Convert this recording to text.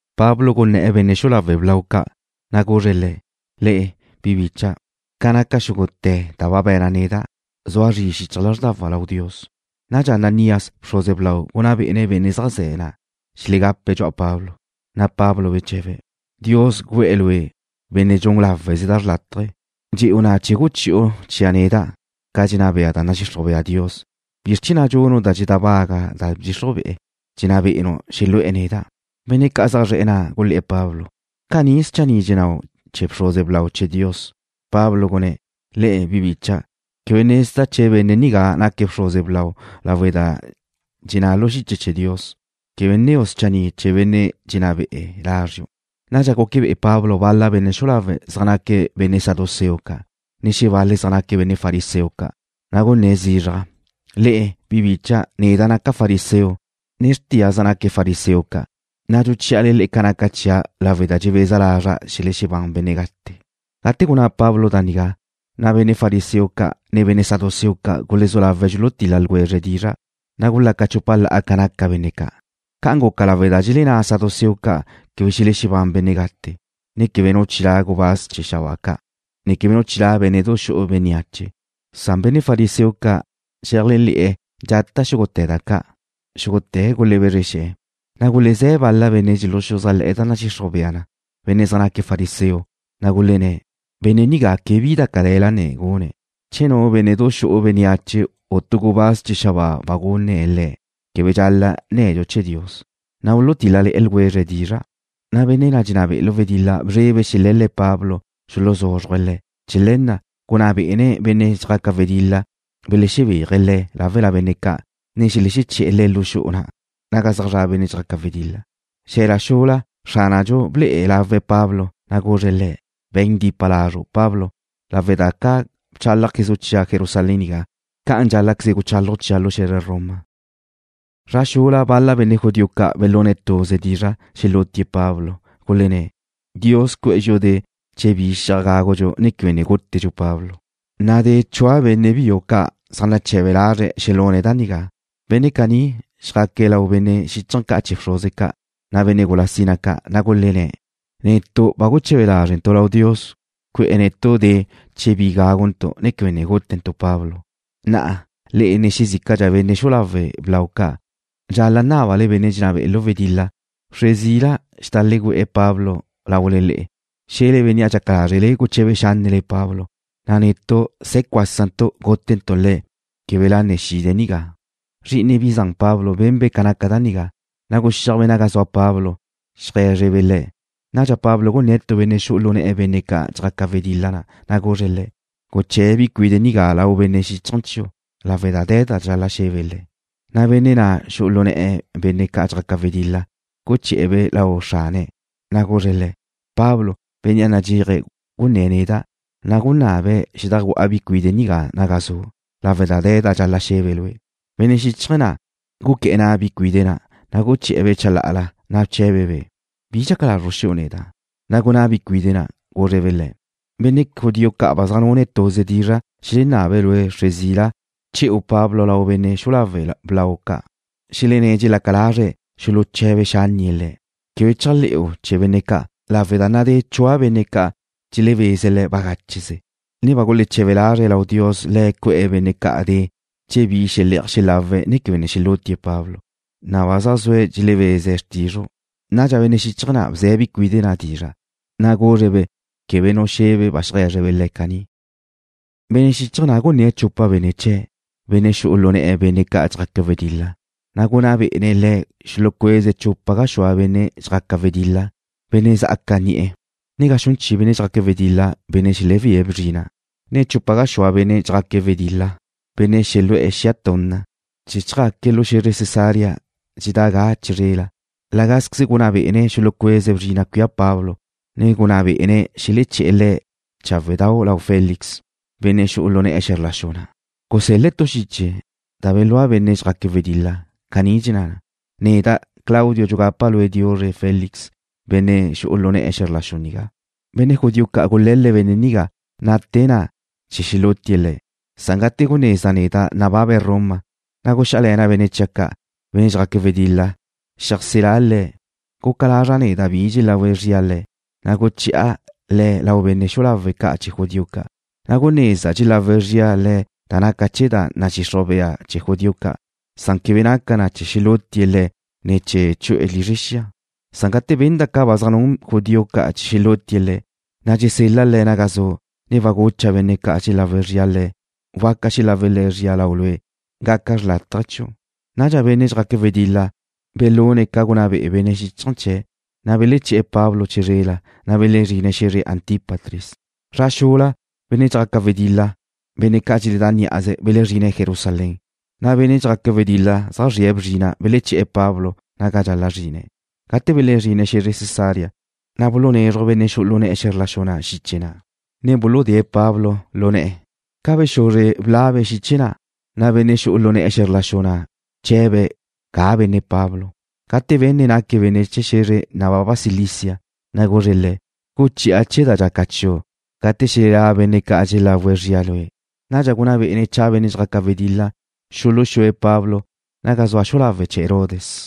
Pablo gunné̱'e̱ benne' xu'u lawe' blau ca', na' guzre̱' le̱': ―Le'e, bi bicha', ca naca xúgute̱ da ba be̱na' neda', zua zri xichaj lázrdawa' lau Dios. Nadxa Ananías, bxruze blau, gunná bé'ene̱' benne' zaj ze̱' na' xelegape̱' dxu'a Pablo. Na' Pablo beche̱be̱': ―Dios güe̱'e̱ lue', benne' dxun láweze da xrlátaje. Dxe'u na' chee̱ guchi'u chia' neda' ca dxenná bea da nadxixruj bea Dios. ¿Bizr chee̱ na' dxunu' da dxedábaga da bdxixruje̱', dxenná be'enu' xelu'e̱ neda'? Benne' ca' zaj zre̱'e̱ na' gulé̱'e̱ Pablo: ―¿Caní schanni' dxennáu' chee̱ bxruze blau chee̱ Dios? Pablo gunné̱': ―Le'e, bi bicha', quebe gunezda' che benne' nigá naque̱' bxruze blau lawe' da dxenná lu xiche chee̱ Dios: Quebe nneu' schanni' chee̱ benne' dxenná be'e̱ lázriu'. Nadxa guque bé'ene̱' Pablo bal-le̱' benne' xu'u lawe' zaj naque̱' benne' saduceo ca', na' xebal-le̱' zaj naque̱' benne' fariseo ca', na' gunné̱' zizraj: ―Le'e, bi bicha', neda' naca' fariseo, ne xrtia' zaj naue̱' fariseo ca', na' dxuchí'ale ca naca chia' lawe' da dxebeza lazra' xelexebán benne' gate. Gate gunná Pablo da nigá, na' benne' fariseo ca', ne benne' saduceo ca' gulezú lawe̱' dxulutil-la ljwezre̱' dizra', na' gulaca chupa la'a ca naca benne' ca'. Ca'an guca lawe' da dxelenná saduceo ca' quebe xelexebán benne' gate, ne quebe nu chilá' gubáz chee̱ xabáa ca', ne quebe nu chilá' bénne'du xu'u bénneache, san benne' fariseo ca' dxeléajle̱'e̱ dxata' xúgute̱ da ca'. Xúgute̱' gulebezre xe̱'e̱, na' gulezé̱ bal-la benne' dxuluxuzájle̱'e̱ da nadxixruj bea na, benne' zaj naque̱' fariseo, na' gulenné̱': ―Benne' nigá quebe bi da cale̱la ne gune̱'. Che nu bénnedu xu'u bénneache, u tu gubáz chee̱ xabáa ba gunné̱' le̱', quebe dxal-la' nne̱dxu chee̱ Dios. Na' bulutíl-lale̱'e̱ ljwezre̱' dizra', na' benne' na' dxenná be'e̱ lu wedil-la bzrebe̱' xele̱l-le̱' Pablo xuluzúzruje̱' le̱'. Chee̱ le̱ na' gunná bé'ene̱' benne' dxjaca wedil-la xelexebéaje̱' le̱' láwela benne' ca', ne xelexeché'e̱ le̱' lu xu'u na' naga zaj zra' benne' dxjaque̱' wedil-la. Xe̱la xula, Xránadxu ble'e lawe̱' Pablo, na' guzre̱' le̱': ―Be̱n dipa lazru', Pablo, lawe' da ca bchálajquezu' chia' Jerusalén nigá, ca'an dxál-la'queze guchálaju' chia' lu xe̱zre Roma. Zra xula bal-la benne' judío ca' belune̱' tuze dizra' xelútie̱' Pablo. Gulenné̱': ―Dios cu'e̱ dxi'u de' che bi xi'aj gágudxu, ne quebe ne gútedxu Pablo. Nadé chua benne' biu ca' zaj nache̱be lazre̱' xelune̱' da nigá. Benne' caní xjaque̱' lau benne' xíchaje̱ ca' chee̱ bxruze ca', ne benne' gula sina ca', na' gulenné̱': ―Netu' ba guche̱be lázrentu' lau Dios cu'e̱ netu' de' che bi gáguntu', ne quebe ne gútentu' Pablo. Na'a, le'e, ne xezícadxa benne' xu'u lawe' blau ca' dxal-la' nábale benne' dxenná be'e̱ lu wedil-la xedajlegüe̱'e̱ Pablo wxre zila laule le'e, xe̱le bénnea' dxaca lázrele guché̱be xánnele Pablo, na' netu' se̱ cuásantu' gútentu' le̱' québela ne xide̱' nigá. Zri'ine bi zan Pablo benbe' ca naca da nigá, na' guxíajbe' naga zua Pablo cheajé̱zrebe' le̱'. Nadxa Pablo gunné̱' tu benne' xu'u lu ne̱'e̱ benne' ca' dxjaque̱' wedil-la, na' guzre̱' le̱': ―Guché̱' bi cuide' nigá lau benne' xíchaje̱ chiu' lawe' da de̱ da dxal-la' xe̱be' le̱'. Na' benne' na' xu'u lu ne̱'e̱ benne' ca' dxjaque̱' wedil-la guché̱'e̱-be' lau xrane̱', na' guzre̱' le̱': ―Pablo, bénnea' nadxéaje̱' gunné̱' neda', na' gunabe̱' xedajgu'a bi cuide' nigá naga zu' lawe' da de̱ da dxal-la' xe̱be' lue'. Benne' xíchaje̱ na' guqué̱'e̱ na' bi cuide' na', na' guché̱'e̱-be' chalá'ala, ne bche̱be̱'-be': ―¿Bi dxaca lazru' xu'u neda'? Na' gunná bi cuide' na', gúzrebe' le̱': ―Benne' judío ca' ba zaj nune̱' tuze dizra' xelenabe̱' lue' che̱'u Pablo wxre zila lau benne' xu'u lawe' blau ca', xelenné̱' dxelaca lazre̱' xuluche̱be xánnie̱' le̱'. Quebe chéajle̱'u chee̱ benne' ca' lawe' da nadé chua benne' ca' xelebeze̱' le̱' bagácheze, ne ba guleche̱be lazre̱' lau Dios Le̱' cu'e̱ benne' ca' de' che bi xele'aj xelawe̱', ne quebe ne xelútie̱' Pablo. Na'a ba zaj zue̱' dxelebeze̱' xrtizru'. Nadxa benne' xíchaje̱ na' bze̱' bi cuide' na' dizra', na' guzre̱'-be' quebe nu xe̱be' ba xeajé̱zrebe' le̱' caní. Benne' xíchaje̱ na' gunné̱' chupa benne' chee̱', benne' xu'u lu ne̱'e̱ benne' ca' dxjaque̱' wedil-la, na' gunná bé'ene̱' le̱' xulucueze̱' chupa gaxúa benne' dxjaque̱' wedil-la, benne' sa'aca ni'e̱, ne ga xun chi benne' dxjaque̱' wedil-la, benne' xelebía bzrina', ne chupa gaxúa benne' dxjaque̱' wedil-la, benne' xelu'e̱ xia tunna, chee̱ chjaque̱' lu xe̱zre Cesarea dxedá' ga chizrela. La gázqueze gunná bé'ene̱' xulucueze̱' bzrina' cuía Pablo, ne gunná bé'ene̱' xeleché̱'e̱ le̱' cháwedau' lau Félix, benne' xu'u lu ne̱'e̱ xe̱zr la xu na' waláz chee̱ Roma. Gusel-le̱' tu xiche da belúa benne' dxjaque̱' wedil-la. Caní naxúaj na: Neda' Claudio, dxugapa' lue' diuzre Félix, benne' xu'u lu na'u xe̱zr la xu nigá. Benne' judío ca' gule̱l-le̱' benne' nigá ná'tega na'a chee̱ xelútie̱' le̱'. Gate gunezda' neda' nababe̱' Roma, na' guxíajle̱na' benne' chia' ca', benne' dxjaque̱' wedil-la, xeajselá' le̱'. Guca lazra' nezda' bi dxelagu zria le̱', na' guche̱'a le̱' lau benne' xu'u lawe' ca' chee̱ judío ca'. Na' gunezda' dxelagu zria le̱' da naca chee̱ da nadxixruj bea chee̱ judío ca', san quebe naca na chee̱ xelútie̱' le̱', ne chee̱ chu'e̱ lizre xia. Gate benda' ca ba zaj nun judío ca' chee̱ xelútie̱' le̱', na' dxusel-la' le̱' naga zu', ne ba gucha' benne' ca' dxelagu zria le̱' waca xelawe̱' le̱' zria lau lue'. Gaca xrlátaje chiu'. Nadxa benne' dxjaque̱' wedil-la belune̱' ca gunná be'e benne' xíchaje̱ chee̱', na' beleché̱'e̱ Pablo chizrela, na' belezrine̱' xe̱zre Antípatris. Zra xula benne' dxjaca wedil-la, benne' ca' dxeledá' ní'aze, belexezrine̱' Jerusalén, na' benne' dxjaque̱' wedil-la zaj zrie̱' bzrina' beleché̱'e̱ Pablo naga dxal-la' zrine̱'. Gate belezrine̱' xe̱zre Cesarea, na' bulunézruje̱' benne' xu'u lu ne̱'e̱ xe̱zr la xu na' xiche na', ne buludée̱' Pablo lu ne̱'e̱. Ca bexuzre blabe̱' xiche na', na' benne' xu'u lu ne̱'e̱ xe̱zr la xu na' bche̱be̱' ga benne' Pablo. Gate benne̱' naque̱' benne' chee̱ xe̱zre nababa Cilicia, na' guzre̱' le̱': ―Guchi'a chee̱ da dxaca chiu' gate xelelá' benne' ca' dxelagu zria lue'. Nadxa gunná bé'ene̱' cha benne' dxjaca wedil-la xuluxúe̱' Pablo naga zua xu'u lawe' chee̱ Herodes.